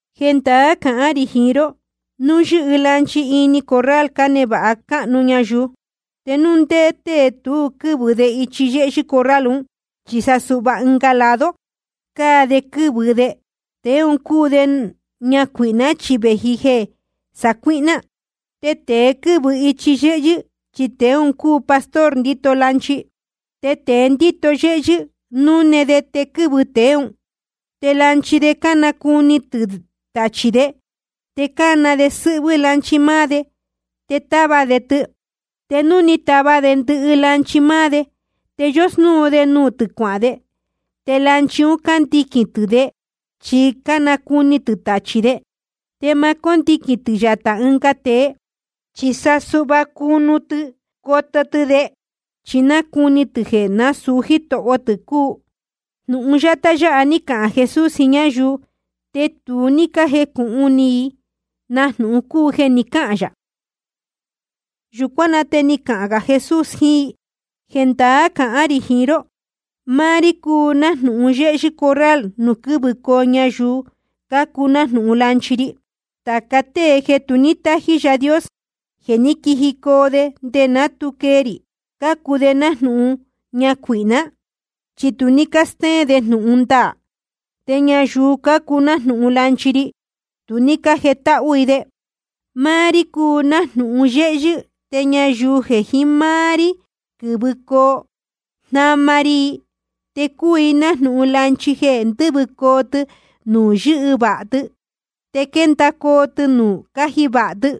’Jendaá cahán rī jiín ró, núu yɨ́hɨ lanchi ini corral cánevāha cáhnu ñayuu, te núu ndé tée tu quɨ́vɨ de ichi yéhyɨ́ corral un, chi sa suhva ɨnga lado cáa de quɨ́vɨ de, tēe un cúu ñacuīhná, chi vēji jeē sacuíhná. Te tēe quɨ́vɨ ichi yéhyɨ́, chi tēe un cúu pastor ndíto lanchi. Te tēe ndíto yéhyɨ́, núne de te quɨ́vɨ tēe ún. Te lanchi de cánacuni tɨ̄ tachī de. Te cána de sɨ́hvɨ́ lanchi máá de, te táva de tɨ. Te núu ni tava de ndɨhɨ lanchi máá de, te yósnúu de nuū tɨ̄ cuahān de. Te lanchi un cándiquīn tɨ̄ de, chi nácuni tɨ̄ tachī de. Te ma cóndiquīn tɨ̄ yatā ɨnga tēe, chi sa suhva cunu tɨ coto tɨ de, chi nácuni tɨ̄ jeē nasūu jítoho tɨ̄ cúu. Jnūhun yátá yáha ní cahān Jesús jiín ñáyuu, te tu ní cájecūhun ni i na jnūhun cúu jeē ni cáhān yā. Yūcuán na te ni cahān gā Jesús jiín i: Jendaá cahán rī jiín ró: Máá rí cúu nájnūhun yéhyɨ́ corral nuū quɨ́vɨcoo ñayuu cácuu nájnūhun lanchi ri. Tāca tée jeē tu ní tájí Yaā Dios, jeē ní quijicoo de nde ná tu quee rī, cácuu de nájnūhun ñacuīhná, chi tu ní cástéén de jnūhun ndaā. Te ñayuu cácuu nájnūhun lanchi ri, tu ní cájetáhú i de. Máá rí cúu nájnūhun yéhyɨ́. Te ñayuu jeē jiín máá rí quɨ́vɨcoo, jnama ri i. Te cuu i nájnūhun lanchi jeē ndɨ́vɨcoo tɨ nuū yɨ́hɨ vāha tɨ, te quéndacoo tɨ nuū cáji vāha tɨ.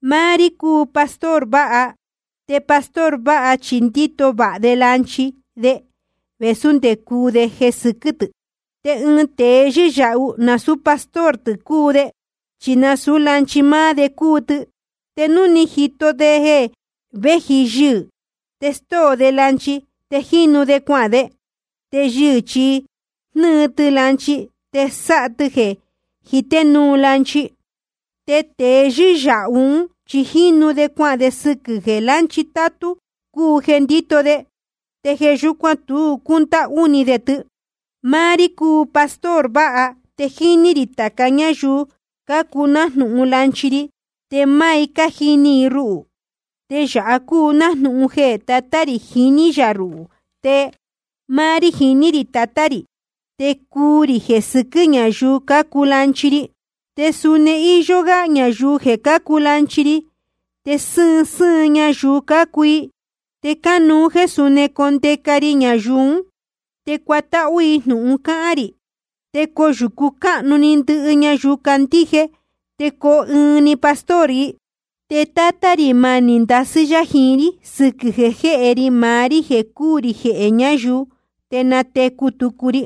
Máá rí cúu máá pastor vāha. Te pastor vāha chi ndíto vāha de lanchi de, vēsú nde cuu de jeē sɨquɨ́ tɨ̄. Te ɨɨn tēe yɨ́yāhu, nasūú pastor tɨ̄ cúu de, chi nasūú lanchi máá de cúu tɨ. Te núu jíto de jeē véji yɨhɨ̄, te stóo de lanchi, te jínu de cuahān de. Te yɨhɨ̄ chi jnɨ́ɨ tɨ lanchi, te sáha tɨ jeē jité núu lanchi. Te tēe yɨ́yāhu ún chi jínu de cuahān de sɨquɨ̄ jeē lanchi tátú cúu jeē ndíto de, te jeē yúcuan tu cúndáhú ni de tɨ. ’Máá rí cúu máá pastor vāha. Te jíní rī tāca ñáyuu cácuu nájnūhun lanchi ri, te máá i cájini i ruhū. Te yāha cúu nájnūhun jeē Tatá rī jiní yā ruhū, te máá rí jiní rī Tatá rī. Te cuu rī jeē sɨquɨ́ ñayuu cácuu lanchi ri. Te suni íyó gá ñayuu jeē cácuu lanchi ri, te sɨ́ɨn sɨ́ɨn ñayuu cácuu i. Te cánuú jéē suni condeca ri ñayuu ún. Te cuatáhú i jnūhun cáhán rī. Te coyūcu cáhnu‑ni ndɨhɨ ñayuu candíje, te coo ɨɨn‑ni pastor i. ’Te Tátá rī manī ndasɨ́ yá jiín rí sɨquɨ̄ jeē jéhe ri maá rí jeē cúū rī jehē ñayuu, te natecu tucu ri.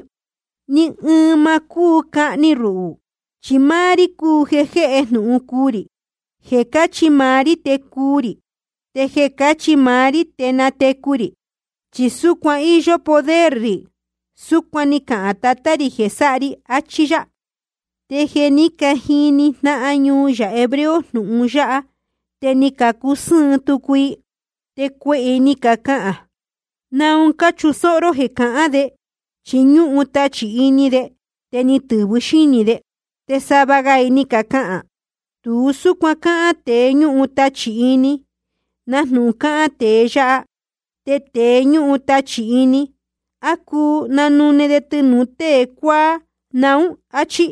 Ni ɨɨn ma cúu cahni ruhū, chi máá rí cúu jeē jéhe jnūhun cuu rī. Jeē cachí máá rí te cuu rī, te jeē cachí máá rí te natecu rī, chi súcuan íyó poder rī. Súcuan ni cahān Tatá rī jeē sáha ri. Achí yá. Te jeē ní cajini jnáhan ñuu yā hebreo jnūhun yáha, te ni cacusɨ́ɨn tucu i. Te cuehē i ni cacahān: ¿Naun cáchusóhó ró jeē cahán de? Chi ñúhun tachī ini de, te ni tɨ̄vɨ xínī de. Te sava ga i ni cacahān: Tu súcuan cáhán tēe ñúhun tachī ini, nájnūhun cáhán tēe yáha. Te tēe ñúhun tachī ini, ¿á cuu nanune de tɨnūu tée cuáá naún? Achí.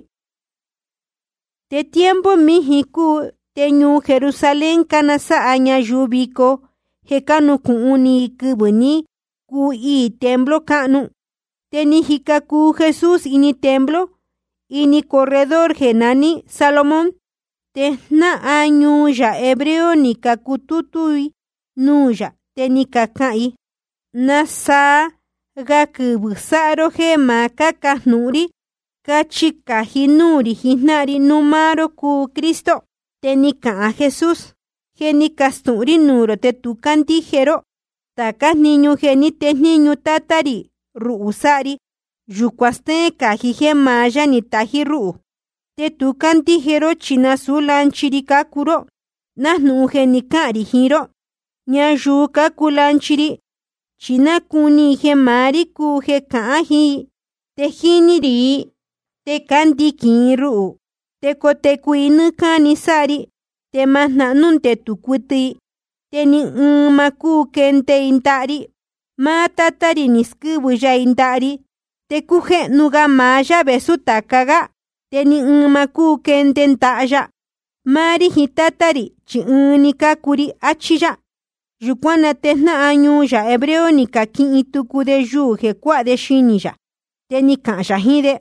Te tiempo míjin cúu, te ñuu Jerusalén cánasáha ñayuu vico jeē cánucūhun ni i quɨvɨ̄ ní cuhiī templo cáhnu. Te jíca cuu Jesús ini templo, ini corredor jeē naní Salomón. Te jnáhan ñuu yā hebreo ni cacutútú i nuū yā, te ni cacahān i: ¿Nasaa ga quɨvɨ̄ sáha ró jéē ma cucáhnu ni rī? Cachi cají núū rī jijnáhan ri núu máá ró cúu Cristo. Te ni cahān Jesús: Je ni castūhun rí nuū rō, te tu ní cácandíje ró. Tācá jniñu jeē ní tejníñu Tátá rī ruhū sáha ri, yūcuan stéén cají jéē maá yá ni tají rúhū. Te tu cácandíje ró, chi nasūú lanchi ri cácuu ró, nájnūhun je ni cahān rī jiín ró. Ñayuu cácuu lanchi ri, chi nácuni i jeē maá rí cúu jeē cahán jiín i. Te jíní rī i, te cándiquīn i ruhū. Te cotecu i nɨ́ɨ́ cáni sáha ri, te ma jnahnú ndetū cuɨtɨ i. Te ni ɨɨn ma cúu quende i ndaha ri. Máá Tátá rī ni squɨ́vɨ ya i ndaha ri. Te cújéhnu ga maá yá vēsú tāca gá. Te ni ɨɨn ma cúu quende i ndaha ya. Máá rí jiín Tátá rī, chi ɨɨn‑ni cúu ri, achí yá. Yūcuán na te jnáhan ñuu yā hebreo ni caquihin tucu de yuū jeē cuáha de xinī yā. Te ni cahān yā jiín de: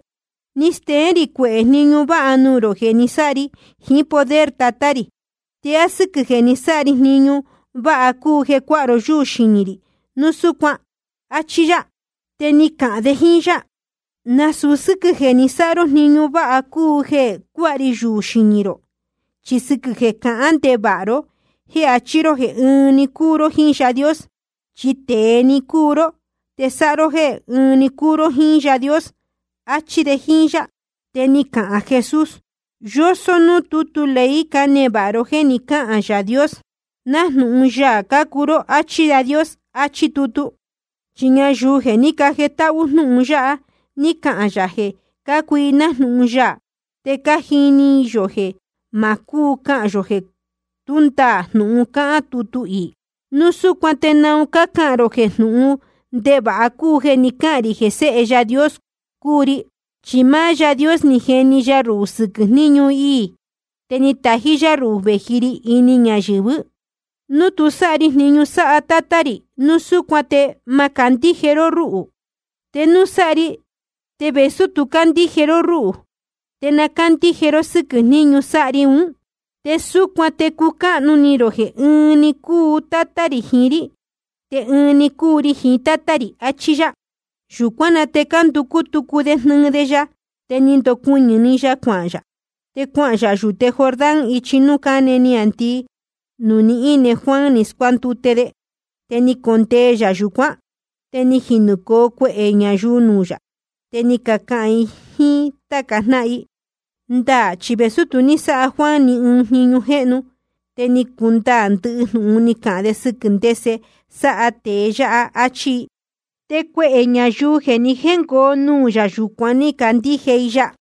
Ni steén rī cuehē jniñu váha nuū rō jeē ni sáha ri jiín poder Tatá rī. ¿Te á sɨ́quɨ̄ jeē ni sáha ri jniñu váha cúu jeē cuáha ró yúū xinī rī núu súcuan? Achí yá. Te ni cacahān de jíín yá: Nasūu sɨ́quɨ̄ jeē ni sáha ró jniñu váha cúu jeē cuáha ri yuū xinī rō, chi sɨquɨ̄ jeē cahán ndevāha ró jéē achí ró jeē ɨnuú cúu ró jíín Yaā Dios. Chi tēe‑ni cúu ró, te sáha ró jéē ɨnuú cúu ró jíín Yaā Dios. Achí de jíín yá. Te ni cahān Jesús: Yósó núū tútu ley cánevāha ró jéē ni cáhān Yaā Dios: Nájnūhun yaā cácuu ró, áchí Yaā Dios, achí tutu. Chi ñayuu jeē ní cajetáhú jnúhun ya, ni cahān yā jeē cácuu i nájnūhun yaā. Te cájini yō jeē ma cúu cahān yō jeē tú ndaā jnūhun cáhán tutu iī. Núu súcuan ¿te naun cácahān rō jeē jnúhun ndevāha cúu jeē ni cáhān rī jeē Séhe Yaā Dios cúu ri? Chi máá Yaā Dios ni jeni ya ruhū sɨquɨ̄ jníñu iī, te ni tají yá ruhū vēji ri ini ñayɨ̄vɨ́. Núu tu sáha ri jniñu sáha Tátá rī, núu súcuan te ma candíje ró rúhū. Te núu sáha ri, te vēsú tu cácandíje ró rúhū, te na cándíje ró sɨ́quɨ̄ jniñu sáha ri ún. Te súcuan te cucáhnu ni rō jeē ɨɨn‑ni cúu Tátá rī jiín rí, te ɨɨn‑ni cúu ri jiín Tátá rī. Achí yá. Yūcuán na te cánducú tucu de jnɨɨ de ya. Te ni ndoñúhún‑ni ya cuahān yā. Te cuanuhun yā yūte Jordán ichi núū cáne niāndii, nuū ni íne Juan ni scuándute de. Te ni condee yā yūcuán. Te ni quijicoo cuehē ñayuu nuū yā, te ni cacahān i jíín táca jnáhan i: Ndaā chi vēsú tu ní sáha Juan ni ɨɨn jniñu jéhnu, te ni cundaā ndɨhɨ jnūhun ni cahān de sɨquɨ̄ ndese sáha tēe yáha. Achí i. Te cuehē ñayuu jeē ni jéngoo nuū yā yūcuán, ni cacandíje i ya.